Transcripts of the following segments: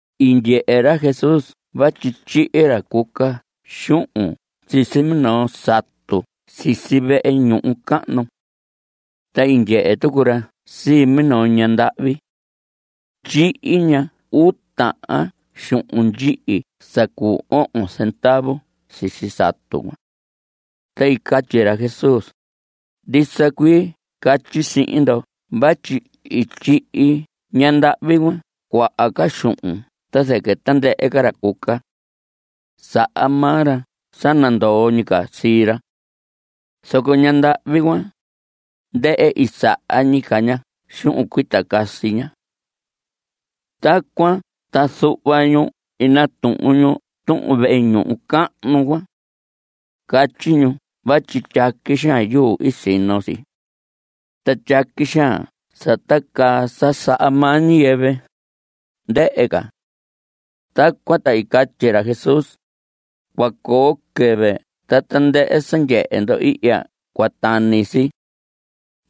I ndyehe ra Jesús vatyi tyihi ra cuca xuhun sisi minoo satu sisi vehe ñuhu cahnu. Ta i ndyehe tucu ra sii minoo ñaha ndahvi. Tyihi ña uu tahan xuhun ndyihi sa cu ohon zendavu sisi satu cuan. Ta i catyi ra Jesús: Ndisa cuii catyi sihin ndo vatyi i tyihi ñandahvi cuan cuaha ca xuhun ta zɨquɨ tandɨhɨ ca ra cuca. Saha maa ra sa nandoo ñi ca sii ra. Zoco ñandahvi cuan, ndɨhɨ i saha ñi ca ña xuhun cuita casi ña. Tacuan ta zuhva ñu i natuhun ñu tuhun vehe ñuhu cahnu cuan. Catyi ñu vatyi tyaqui xaan yuu i sino si. Ta tyaqui xaan sa tacaa sa saha maa ñiyɨvɨ, ndɨhɨ ca. Tacuan ta i catyi ra Jesús: Cua coo quɨvɨ ta tandɨhɨ sa ndyehe ndo ihya cua tani si.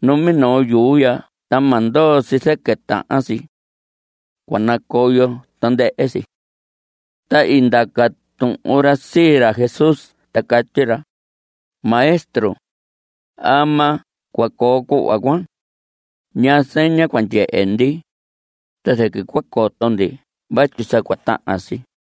Numinoo yuu ya ta ma ndoo si zɨquɨ tahan si. Cua nacoyo tandɨhɨ si. Ta i ndaca tuhun ra sii ra Jesús ta catyi ra: Maestro, ¿ama cua coo cuhva cuan? ¿Ñaa zeña cua ndyehe ndi, ta zɨquɨ cua coto ndi vatyi sa cua tahan si?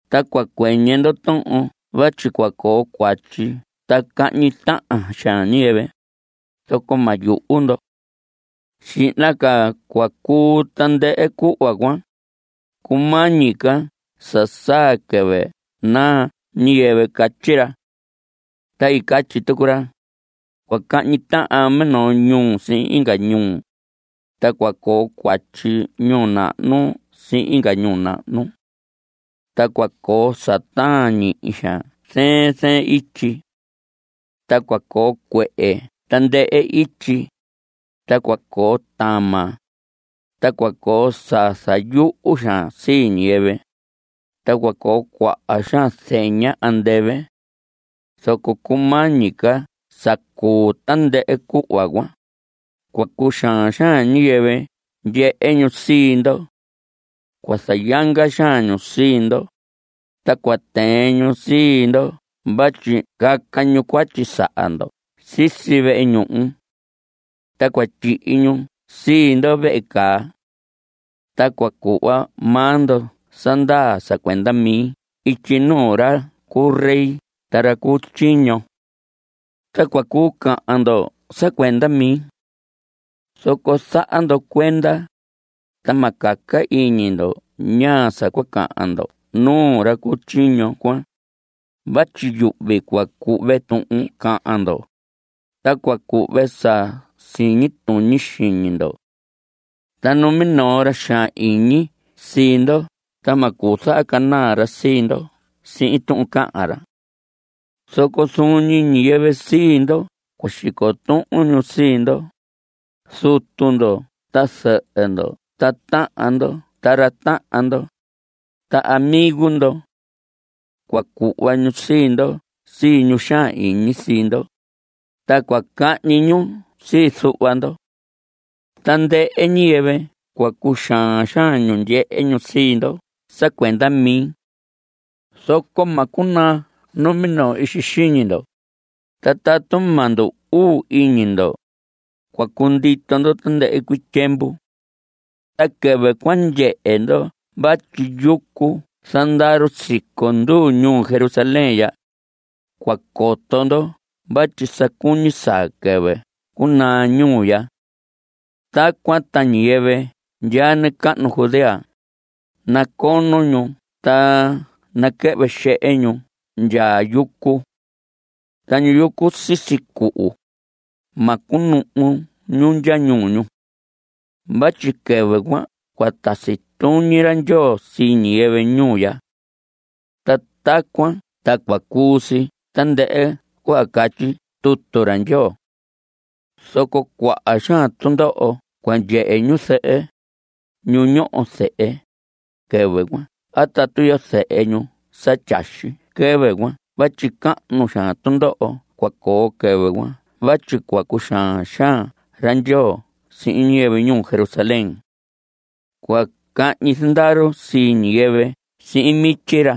Ta cua cuɨñɨ ndo tuhun vatyi cua coo cuatyi ta cahñi tahan xaan ñiyɨvɨ, zoco ma yuhu ndo. Xihna ca cua cuu tandɨhɨ cuhva cuan, cumañi ca sa saa quɨvɨ naa ñiyɨvɨ. Catyi ra. Ta catyi tucu ra: Cua cahñi tahan minoo ñuu sihin inga ñuu, ta cua coo cuatyi ñuu nahnu sihin inga ñuu nahnu. Ta cua coo sa taan ñihi xaan zɨɨn zɨɨn ityi. Ta cua coo cuehe tandɨhɨ ityi. Ta cua coo tama. Ta cua coo sa zayuhu xaan sii ñiyɨvɨ. Ta cua coo cuaha xaan zeña andɨvɨ. Zoco cumañi ca sa cuu tandɨhɨ cuhva cuan, cua cuxaan xaan ñiyɨvɨ ndyehe ñu sii ndo. Cua zayanga xaan ñu sii ndo, ta cua tɨɨn ñu sii ndo vatyi caca ñu cuatyi saha ndo sisi vehe ñuhu. Ta cua tyihi ñu sii ndo vehe caa. Ta cua cuhva maa ndo sa ndaa sa cuenda mi ityi nuu ra cu rey ta ra cu tyiño. Ta cua cuu cahan ndo sa cuenda mi. Zoco zaha ndo cuenda, ta ma caca iñi ndo ñaa sa cua cahan ndo nuu ra cu tyiño cuan. Vatyi yuhvi cua cuhve tuhun cahan ndo, ta cua cuhve sa siñi tuñi xiñi ndo. Ta numinoo ra xaan iñi sii ndo ta ma cuu zahacanaa ra sii ndo sihin tuhun cahan ra. Zoco zuun ñi ñiyɨvɨ sii ndo cua xico tuhun sii ndo, zutu ndo ta zɨhɨ ndo, ta tahan ndo ta ra tahan ndo, ta amigo ndo. Cua cuhva ñu sii ndo sii ñu xaan iñi sii ndo. Ta cua cahñi ñu sii zuhva ndo. Tandɨhɨ ñiyɨvɨ cua cuxaan xaan ñu ndyehe ñu sii ndo sa cuenda mi. Zoco ma cunaa numinoo ixi xiñi ndo. Ta tatu ma ndu‑uu iñi ndo, cua cundito ndo tandɨhɨ cuii tyiemvu. Ta quɨvɨ cua ndyehe ndo vatyi yucu zandaru siconduu ñuu Jerusalén ya, cua coto ndo vatyi sa cuñi saa quɨvɨ cunaa ñuu ya. Tacuan ta ñiyɨvɨ ndyaa nacahnu Judea, nacono ñu ta naquɨhvɨ xehe ñu ndya yucu. Ta ñu yucu sisi cuhu, ma cunuhu ñu ndya ñuu ñu. Vatyi quɨvɨ cuan cua tasi tuñi ra Ndyoo sii ñiyɨvɨ ñuu ya. Ta tacuan ta cua cuu si tandɨhɨ cuhva catyi tutu ra Ndyoo. Zoco cuaha xaan tundoho cua ndyehe ñu zɨhɨ, ñu ñoho zehe, quɨvɨ cuan a tatu iyo zehe ñu sa tyaxi quɨvɨ cuan vatyi cahnu xaan tundoho cua coo quɨvɨ cuan vatyi cua cuxaan xaan ra Ndyoo sihin ñiyɨvɨ ñuu Jerusalén. Cua cahñi zandaru sii ñiyɨvɨ sihin mityi ra,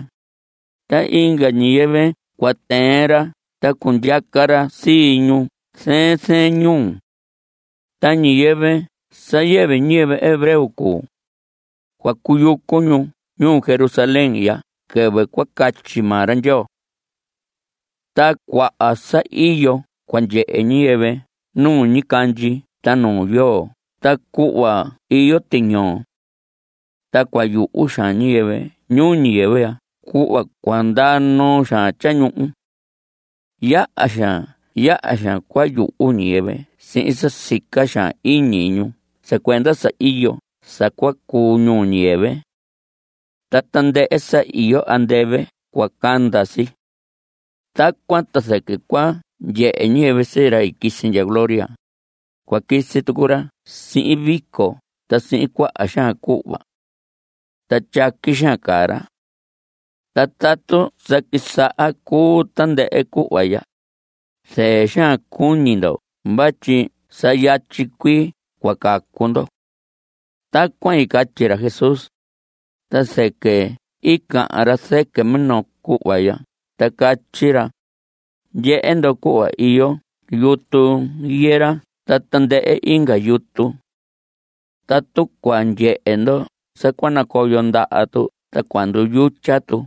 ta inga ñiyɨvɨ cua tɨɨn ra ta cundyaca ra sii ñu zɨɨn zɨɨn ñuu. Ta ñiyɨvɨ sa yɨvɨ ñiyɨvɨ hebreo cuu, cua cuyucu ñu ñuu Jerusalén ndya quɨvɨ cua catyi maa ra Ndyoo. Ta cuaha sa iyo cua ndyehe ñiyɨvɨ nu ñicandyi ta nu yoo ta cuhva iyo tiñoo. Ta cua yuhu xaan ñiyɨvɨ ñuu ñiyɨvɨ ya cuhva cua ndaa noo xaan tyañuhu. Yaha xaan yaha xaan cua yuhu ñiyɨvɨ sihin sa sica xaan iñi ñu sa cuenda sa iyo sa cua cuu ñuu ñiyɨvɨ. Ta tandɨhɨ sa iyo andɨvɨ cua canda si. Tacuan ta zɨquɨ cua ndyehe ñiyɨvɨ sii ra i quisi ndya gloria. Cua quisi tucu ra sihin vico ta sihin cuaha xaan cuhva. Ta tyaqui xaan caa ra. Ta tatu sa quisaha cuu tandɨhɨ cuhva ya, zɨɨ xaan cuñi ndo vatyi sa yatyi cuii cua cacu ndo. Tacuan i catyi ra Jesús, ta zɨquɨ i cahan ra zɨquɨ minoo cuhva ya ta catyi ra: Ndyehe ndo cuhva iyo yutu higuera ta tandɨhɨ inga yutu. Tatu cua ndyehe ndo sa cua nacoyo ndaha tu ta cua nduyutya tu,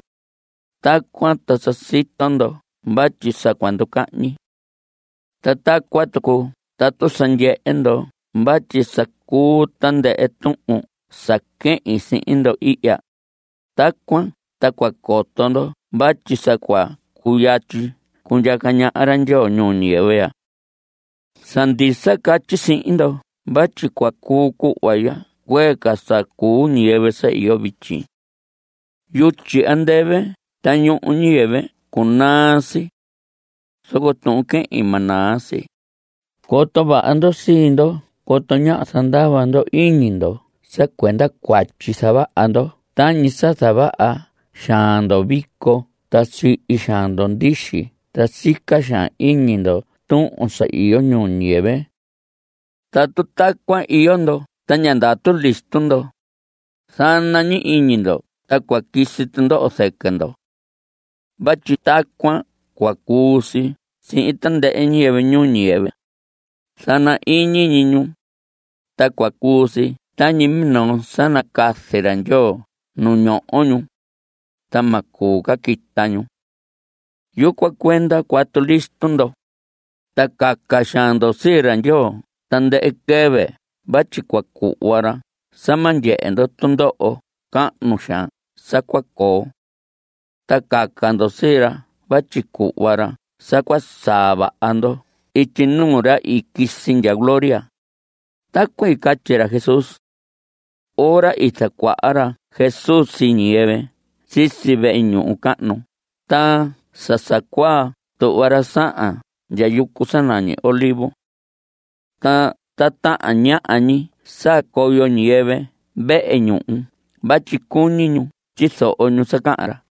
tacuan ta sa sito ndo vatyi sa cua nducahñi. Ta tacuan tucu tatu sa ndyehe ndo vatyi sa cuu tandɨhɨ tuhun sa quehin sihin ndo ihya, tacuan ta cua coto ndo vatyi sa cua cuyatyi cundyaca ñaha ra Ndyoo ñuu ñiyɨvɨ ya. Sa ndisa catyi sihin ndo vatyi cua cuu cuhva ya cuee ca sa cuu ñiyɨvɨ sa iyo vityi. Yutyi andɨvɨ ta ñuhu ñuu ñiyɨvɨ cunaa si. Zoco tuhun quehin ma naa si. Coto vaha ndo sii ndo coto ñáha zandava ndo iñi ndo sa cuenda cuatyi zavaha ndo tañi sa zavaha xaan ndo vico ta sihi xaan ndo ndixi ta sica xaan iñi ndo tuhun sa iyo ñuu ñiyɨvɨ. Tatu tacuan iyo ndo ta ña ndatu listo ndo, zana ñi iñi ndo ta cua quisi tundoho zɨquɨ ndo. Vatyi tacuan cua cuu si sihin tandɨhɨ ñiyɨvɨ ñuu ñiyɨvɨ. Zana ñi iñi ñu, ta cua cuu si tañi minoo sa nacazi ra Ndyoo nu ñoho ñu, ta ma cuu ca quita ñu. Yucuan cuenda cuatu listo ndo, ta caca xaan ndo sii ra Ndyoo tandɨhɨ quɨvɨ vatyi cua cuhva ra sa ma ndyehe ndo tundoho cahnu xaan sa cua coo. Ta caca ndo sii ra vatyi cuhva ra sa cua saa vaha ndo ityi nuu ra i quisi ndya gloria. Tacuan i catyi ra Jesús. Ora i zacuaha ra Jesús sii ñiyɨvɨ sisi vehe ñuhu cahnu ta sa sa cuaa tuhva ra sahan ndya yucu sa nañi Olivos. Ta tahan ñaha ñi saa coyo ñiyɨvɨ vehe ñuhu vatyi cuñi ñu tyizoho ñu sa cahan ra.